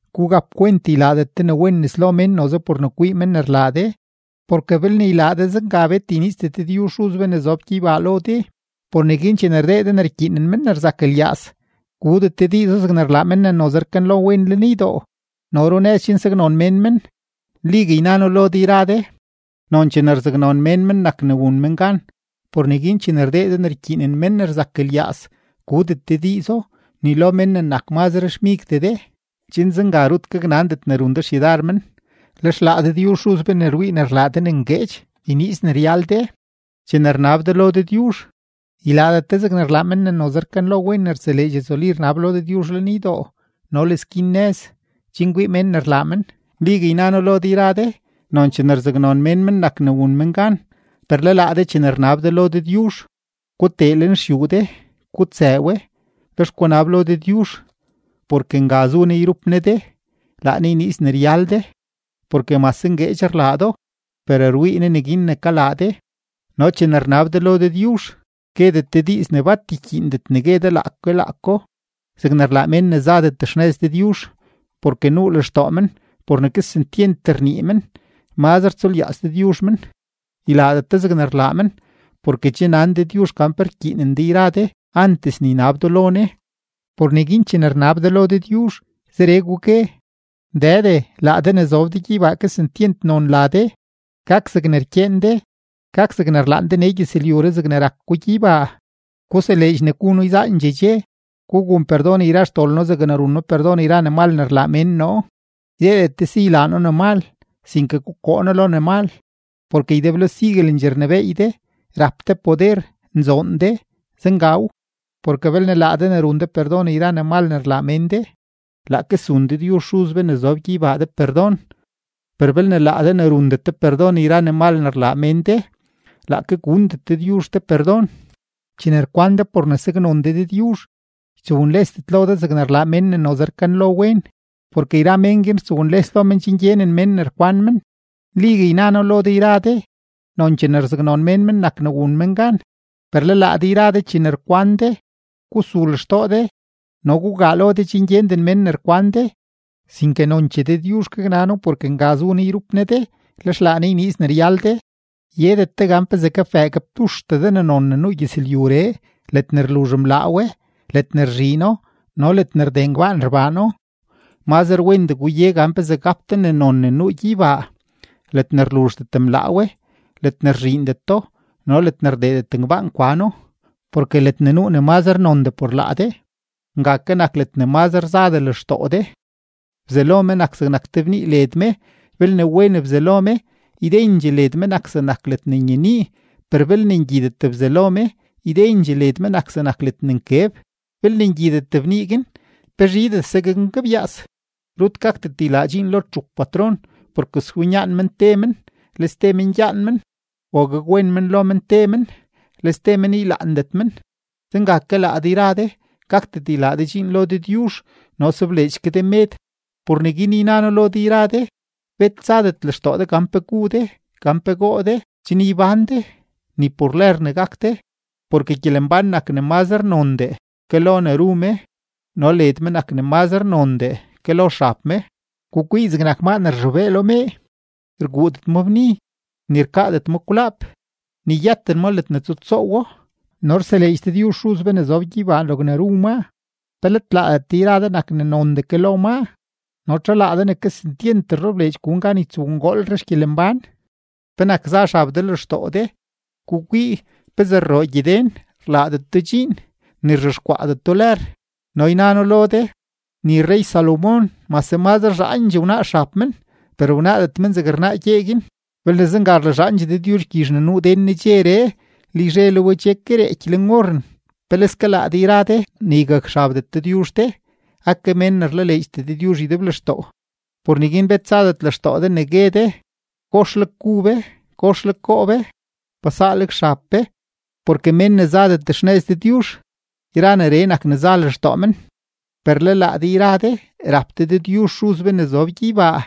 ’Gugapkwent ylaadet de ne wen nes lo mén noze por ne kwii men ne rlaa de. Porke belne ylaa de zenga, bet yniizdet Dëdyuzh Xuz be ne zob gyeybaa lo de. Por neguin chene rdee de ne rkyiinen men ne rzak lyaaz, gudet de diizo zegne rlaa men ne noze rkanlo wen lenydoo no le runëz chen saknon mén men. Nligue yna noo lo de yra de, nonchee ne rzaknon mén men nak ne wun men gan. Por neguin chene rdee de ne rkyiinen men ne rzak lyaaz, gudet de diizo ni lo mén ne nak mazre xmigdee de, chen zenga rut gaknandet ne run de xyudar men. Lex laa Dëdyuzh Xuz be ne rwii ne rlaa de ne ngueedx yniiz ne ryal de. ’Chene rnab de lo Dëdyuzh, ylaadet de zeg rlaa men ne noze rkanlo wen ne rtseleedx rzuli rnab lo Dëdyuzh lenydoo no le skin nëz, chen kwii mén ne rlaa men. Nligue yna noo lo de yra de, nonchee ne rzaknon mén men nak ne wun men gan. Per le laa de chene rnab de lo Dëdyuzh, gutee lenxyuu de, gutsëë we; lex gunab lo Dëdyuzh porke nga zu Ne yrup Ne de, laa Ne yniiz ne ryal de, porke mase ngueedx rlaa do, per rwii Ne neguin ne kalaa de. ’No chene rnab de lo Dëdyuzh, guedet de diiz ne bat rkyiindet ne gue de laake laako zegne rlaa mén ne zadet xnëz Dëdyuzh, porke nuu lextoo men por ne kesentyent rnii men mazre tsulyaaz Dëdyuzh men. Ylaadet de zegne rlaa men, porke che nan Dëdyuzh gan pe rkyiinen de yra de antes ne ynab do lo Ne. Por neguin chene rnab de lo Dëdyuzh, zeree gugue: Dëde, laa de ne zob de gyeybaa, kesentyent nzoon la de. Gak zegne rkyeen de. Gak zegne rlaan de nee gyëzlyuree zegne rak ko gyeybaa. Guseleedx ne gu noo yzaandxee dxe. Gugun perdon yra xdol noo zegne run noo perdon yra ne mal ne rlaa mén noo. Ydeedet de si ylaa noo ne mal, sinke gukoo noo lo ne mal. Porke ydeblo siguelendxee rnebééy de, rap de poder, nzoon de. Zengaw. ’Porke belne laa de ne run de perdon yra ne mal ne rlaa mén de, laake zun Dëdyuzh Xuz be ne zob gyeybaa de perdon. Per belne laa de ne rundet de perdon yra ne mal ne rlaa mén de, laake gundet ke Dëdyuzh de perdon. ’Chene rkwan de por ne rzaknon de Dëdyuzh, ytsownlesdet lo de zegne rlaa yra men ne noze rkanlo wen, porke yra mén guin rtsownles lo men chen gyenen mén ne rkwan men. Nligue yna noo lo de, nonchee ne rzaknon mén men nak ne wun men gan. Per le laa de chene rkwan de, gusul xtoo de no gugaa lo de chen gyenden mén ne rkwan de, sinke nonchee Dëdyuzh gaknano porke nga zu Ne yrup Ne de, lex laa Ne yniiz ne ryal de. ’Yedet de gan pezee gapbëë gapduxtee de ne non ne nuu gyëzlyuree, ledne rluzh mlaa we, ledne rzhiino no ledne rdee ngbaan rbaano. Mazre wendee guye gan pezee gap de ne non ne nuu gyeybaa, ledne rluzhdet mlaa we, ledne rzhiindeto no ledne rdeedet ngbaan kwano. Porke ledne nuu ne mazre nondee por laa de, nga ke nak ledne mazre zadee lextoo de. ’Bzalo me nak zegnak te bnii led me; belne wen bzalo me, ydendxee led me nak zegnak ledne nyenii. Per belne ngyidet bzalo me, ydendxee led me nak zegnak ledne nkeb. Belne ngyidet bnii guin, ¡pe zhidese gaknkebyaas! ’Rut gakdet ylaa dxiin lo txup patron, porke swinyaan men te men, le ste men gyaan men, o gakwen men lo men te men, le ste men ylaandet men. Zenga ke laa de yra de, gakdet ylaa de dxiin lo Dëdyuzh no sobleedx ke de med. ’Por neguin yna noo lo de yra de: Bet tsadet lextoo de gan pe gu de, gan pe goo de chen ybán de, ni por lër ne gak de. Porke gyelembán nak ne mazre nondee ke lo ne ru me no led me nak ne mazre nondee ke lo xab me. Gukwii zegnak maa ne rzhobee lo mee; rguudet ma bni, ni rkaadet ma kwlaap, ni yëten ma ledne tsutsoowo, no rseleedx Dëdyuzh Xuz be ne zob gyeybaa logne ru maa. ¿Pe let laadet de yra de nak ne nondee ke lo maa? No ¿txu laa de ne kesentyent rlebleedx gun gan ytsowngoolre xgyelembán? ’¿Penak za xab de lextoo de? Gukwii pezee rroo gyeden; rlaadeto dxiin, ni rzhexkwaadeto lër, no yna noo lo de, ni rrey-Salomón mase mazre zhaandxee wnaa xab men, per wnaadet men zegne rnaa gyee guin. Belne zenga rlazhaandxee Dëdyuzh gyizh ne nuu den nedxeree, le yzhe le we che ke reeky leen oren, ¡peleske laa de ne ygakxabdet Dëdyuzh de, ake mén ne rlaleedxdet Dëdyuzh ydeblextoo! Por neguin bet tsadet lextoo de ne gue de: “¿Kosleg gu be? ¿Kosleg goo be? ¿Pa saaleg xab be?” Porke mén ne zadet xnëz Dëdyuzh, yra neree nak ne za lextoo men; per le laa de yra de, rap de Dëdyuzh Xuz be ne zob gyeybaa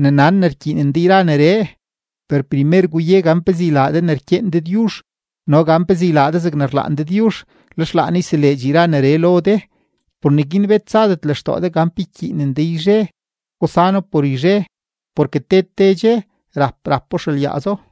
ne nan ne rkyiinen de yra neree. Per primer guye gan pezee ylaa de ne rkyeen Dëdyuzh no gan pezee ylaa de zegne rlaan Dëdyuzh, lex laa Ne yseleedx yra neree lo de. Por neguin bet tsadet lextoo de gan pe ykyiinen de yzhe, gusano por yzhe, porke te te dxe rap rapo xelyaazo.